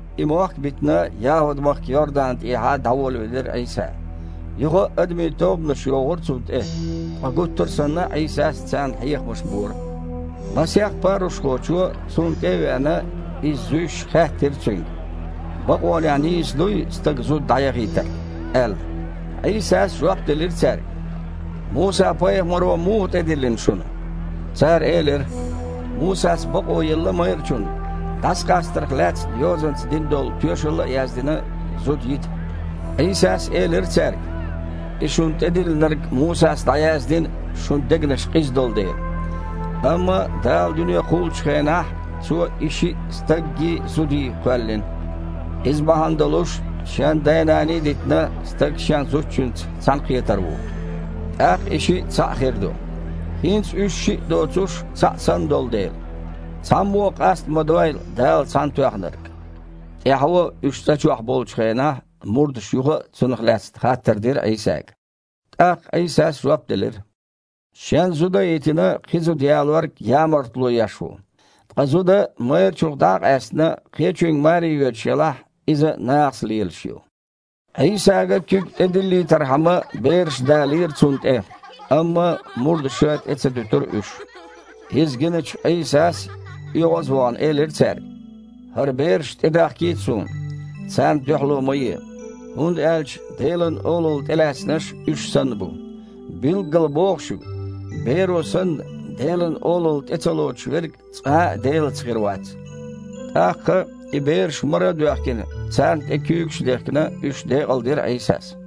И мохк а битина, ЯхІуд-махка Йордан тІехьа дІаволавелира Іийса. Юха а адамийн тобанаш йогІура Цунна тІе, ткъа гуттар а санна Іийсас царна хьехамаш бора. Масех парушхочо, Цунна тІе а веана, Иза зуьйш, хаьттира Цуьнга: «Бакъонехь нийса дуй стага зуда дІаяхийтар?» – аьлла. Іийсас жоп делира цаьрга: «Муса-пайхамаро муха тІедиллина шуна?» Цара элира: «Мусас бакъо елла майрачунна, дІасакъастарх лаьцна йозанца дина долу тоьшалла а яздина, зуда йита». Іийсас элира цаьрга: «И шуна тІедиллинарг Мусас дІаяздина, шун дегнаш къиза долу дела. Амма Дала дуьне кхуллучу хенахь, „Цо и шиъ стаггий, зудий кхоьллина“. „Иза бахьана долуш, шен да-нана а дитина, стаг шен зудчуьнца цхьаьнакхетар ву. ТІаккха и шиъ цхьаъ хир ду“. ХІинца уьш шиъ доцуш, цхьаъ санна долу дела, цхьаммо а къаста ма дойла Дала цхьаьнатоьхнарг!» ТІаьхьо, уьш цІа чохь болчу хенахь, мурдаша юха а цунах лаьцна хаттар дира Іийсага. ТІаккха Іийсас жоп делира: «Шен зуда а йитина, кхин зуда ялорг ямартло еш ву. Ткъа зуда, майрачух дІа а къаьстина, кхечуьнга маре йоьдуш елахь, иза а нахаца лелаш ю». Іийсага куьг тІедиллийтархьама бераш далийра Цунна тІе, амма мурдаша тІе ца дуьтура уьш. Иза гиначу Іийсас, оьгІаз а вахана, элира цаьрга: «ХІара бераш тІедахкийта Суна, царна дуьхьало ма е, хІунда аьлча Делан Олалла тІелаьцнарш уьш санна бу. Билггала боху шуьга: беро санна, Делан Олалла тІе ца лоцуш верг цкъа а Делаца хир вац». ТІаккха, и бераш мара а доьхкина, царна тІе куьйгаш а дехкина, уьш декъалдира Іийсас.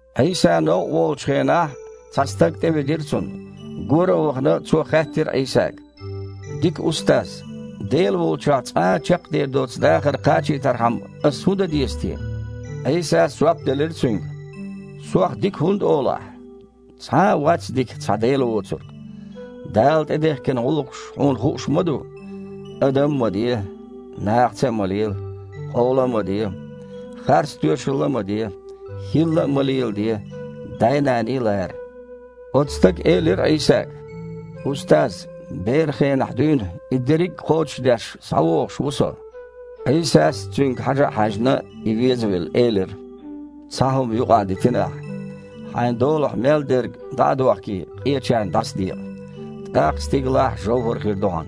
Іийса новкъа волучу хенахь, цхьа стаг тІеведира Цунна. Гора а вахана, цо хаьттира Іийсага: «Дика Устаз! Дела волчохь цкъа а чекхдер доцу дахар кхачийтархьама ас хІун дан деза те?» Іийсас жоп делира цуьнга: «Сох „дика“ хІунда олу ахьа? Цхьа а вац дика, цхьа Дела воцург. Дала тІедехкина гІуллакхаш хьуна хууш ма ду: „Стаг а ма ве, нахаца а ма лела, къола а ма де, харц тоьшалла а ма де, хІилла а ма леладе, да-нана а лара“?» Оцу стага элира Іийсага: «Устаз, беран хенахь дуьйна и дерриг а кхочушдеш, схьавогІуш ву со». Іийсас, цуьнга хьажа а хьаьжна, и везавелла элира: «Цхьа хІума юкъахдитина ахьа. Хьайн долахь мел дерг дІа а дохкий, къечарна дІасадекъа, тІаккха стигалахь жовхІар хир ду хьан.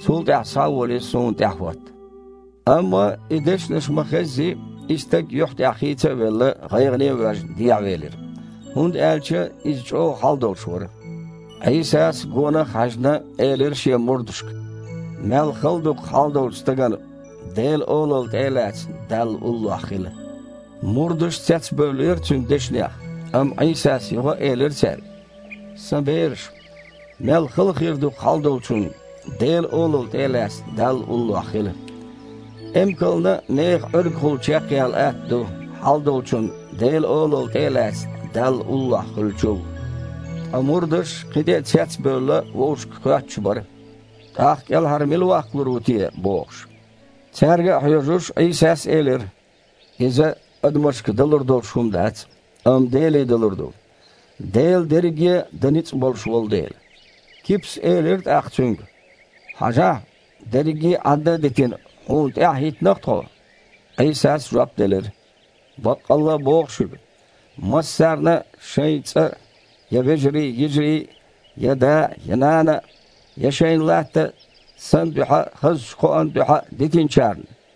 Цул тІаьхьа, схьа а волий, Суна тІаьхьахІотта». Амма и дешнаш ма-хеззи, и стаг юьхь тІехь хийца а велла, гІайгІане а воьжна, дехьавелира, хІунда аьлча иза чІогІа хьал долуш вара. Іийсас, гонах а хьаьжна, элира Шен мурдашка: «Мел хала ду-кх хьалдолчу стагана, Делан Олалла тІе а лаьцна, Далла уллохь хила!» Мурдаш цецбевллера Цуьнан дешнех, амма Іийсас юха а элира цаьрга: «Сан бераш, мел хала хир ду-кх хьалдолчунна, Делан Олалла тІе а лаьцна, Далла уллохь хила. Эмкална а механ Іуьргахула чекхъяла атта ду, хьалдолчунна, Делан Олалла тІе а лаьцна, Далла уллохь хуьлучул». Ткъа мурдаш, кхин тІе а цецбевлла, вовшашка хоьттуш бара: «ТІаккха кІелхьара мила ваккхалур ву те?» – бохуш. Цаьрга а хьоьжуш, Іийсас элира: «Иза адамашка далур долуш хІума дац, амма Деле далур ду, Дела дерриге а дан ницкъ болуш волу дела». Кипас элира тІаккха Цуьнга: «Хьажахьа! Дерриге Іадда а дитина, Хьуна тІаьхьа хІиттина-кх тхо». Іийсас жоп делира: «Баккъалла а боху шуьга: массарна а шайн цІа а, я вежарий-йижарий а, я да а, нана а, я шайн латта а Сан дуьхьа а, хазачу кхоан дуьхьа а дитинчарна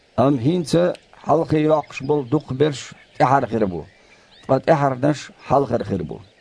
Амма хІинца хьалхе йоккхуш болу дукхахберш тІаьхьара хир бу, ткъа тІаьхьарнаш хьалхара хир бу».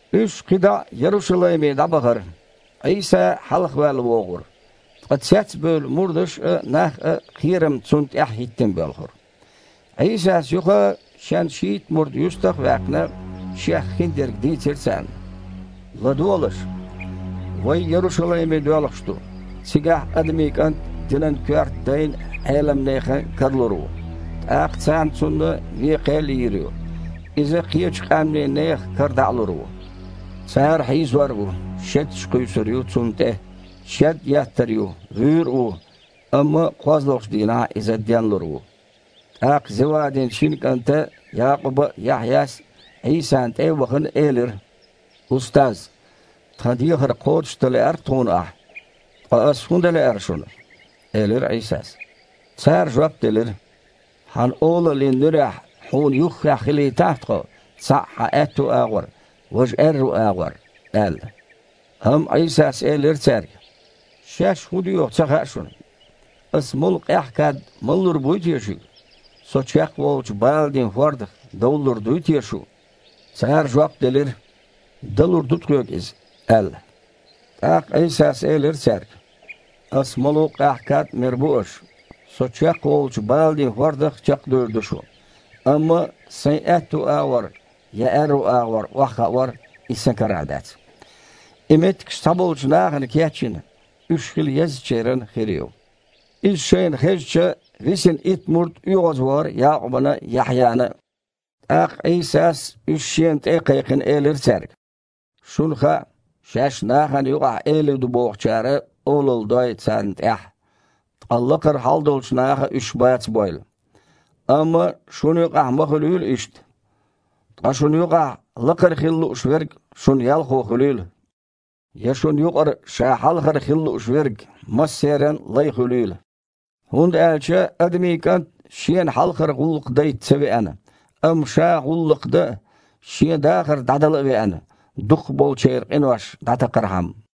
Уьш кхин дІа а Ярушалайме дІабахара. Іийса хьалхаваьлла вогІура, ткъа цецбевлла мурдаш а, нах а кхерамца Цунна тІаьхьа хІиттина боьлхура. Іийсас юха а, Шен шийтта мурд юьстах а ваьккхина, Шех хиндерг дийцира царна: «ЛадогІалаш! Вай Ярушалайме доьлхуш ду, цигахь Адамийн КІант динан коьрта дайн а, Іелам нехан а кара лур ву, тІаккха цара Цунна вен кхел а йийр ю, Иза кхечу къаьмнийн нехан кара дІа а лур ву. Цара хьийзор а ву, шеташ а кхуьйсур ю Цунна тІе, шед еттар а ю, вуьйр а ву, амма кхозлагІчу дийнахь Иза денлур ву». ТІаккха Зевадин шина кІанта Якъуба а, Яхьъяс а, Іийсана тІе а вахана, элира: «Устаз! Тхан дехар кхочушдан лаьар-кх тхуна Ахьа». «Ткъа Ас хІун дан лаьара шуна?» – элира Іийсас. Цара жоп делира: «Хьан олаллин нуьрехь Хьуна юххехь хилийтахь тхо, цхьаъ Хьан аьтту агІор, важа аьрру агІор», – аьлла. Амма Іийсас элира цаьрга: «Шаьш хІун доьху а ца хаьа шуна. Ас молу къаьхьа кад малалур буй те шуьга? Со чекхволучу баланийн хІордах довлалур дуй те шу?» Цара жоп делира: «Далур ду тхоьга иза», – аьлла. ТІаккха Іийсас элира цаьрга: «Аса молу къаьхьа кад а мер бу аша, Со чекхволучу баланийн хІордах а чекхдевр ду шу, амма Сайн аьтту агІор, я аьрру агІор охьахаор – иза Сан карахь дац. И меттигаш цхьаболчу нахана кечйина, уьш хила еззачеран хир ю». Иза шайна хезча, висина итт мурд оьгІазвахара Якъубана а, Яхьъяна а. ТІаккха Іийсас, уьш Шена тІе а кхайкхина, элира цаьрга: «Шуна хаьа, шаьш нахана юкъахь элий ду бохучара олалла дой царна тІехь, ткъа лакхара хьалдолчу наха уьш бацабойла. Амма шуна юкъахь ма хуьлийла иштта. Ткъа шуна юкъахь лакхара хила лууш верг шун ялхо хуьлийла, я шун юкъара ша хьалхара хила лууш верг массеран а лай хуьлийла. ХІунда аьлча Адамийн КІант Шена хьалхара гІуллакх дайта ца веана, амма Ша гІуллакх дан а, Шен дахар дІадала а веана, дукхахболчеран къинош дІатакхархьама».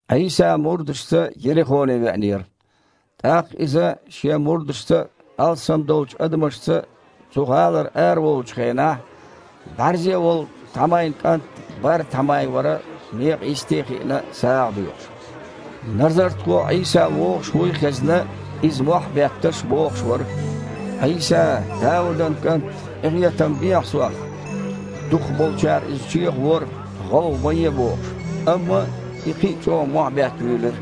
Іийса мурдашца Ерихоне веанера. ТІаккха Иза Шен мурдашца а, алссам долчу адамашца а цу гІалара араволучу хенахь бІаьрзе волу Тхьамайн кІант Бар-Тхьамай вара, некъа йисте а хиъна, сагІа доьхуш. Назартхо Іийса вогІуш вуй а хезна, иза, мохь а бетташ, бохуш вара: «Іийса, Даудан кІант! Къинхетам бехьа сох». Дукхахболчара иза чехавора, гІовгІа ма е а бохуш, амма и кхин а чІогІа мохь бетта вуьйлира: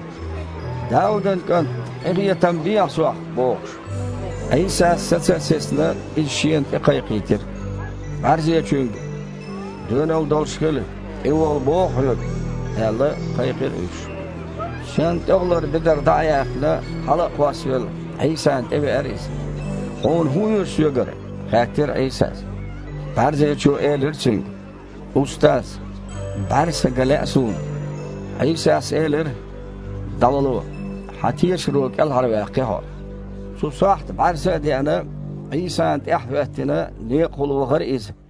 «Даудан кІант! Къинхетам бехьа сох!» – бохуш. Іийсас, саца а сецна, иза Шена тІекхайкхийтира. БІаьрзечуьнга: «Доьналла долуш хила, тІевола боху хьоьга!» – аьлла, кхайкхира уьш. Шен тІехулара бедар дІа а яьккхина, хьала а кхоссавелла, Іийсана тІе веара иза. «Хьуна хІун оьшу Соьгара?» – хаьттира Іийсас. БІаьрзечо элира Цуьнга: «Устаз! БІаьрса ган лаьа суна». Іийсас элира: «ДІавало, хьан тешаро кІелхьарваьккхи хьо». Цу сохьта бІаьрса а деана, Іийсана тІаьхьахІоьттина некъахула вахара иза.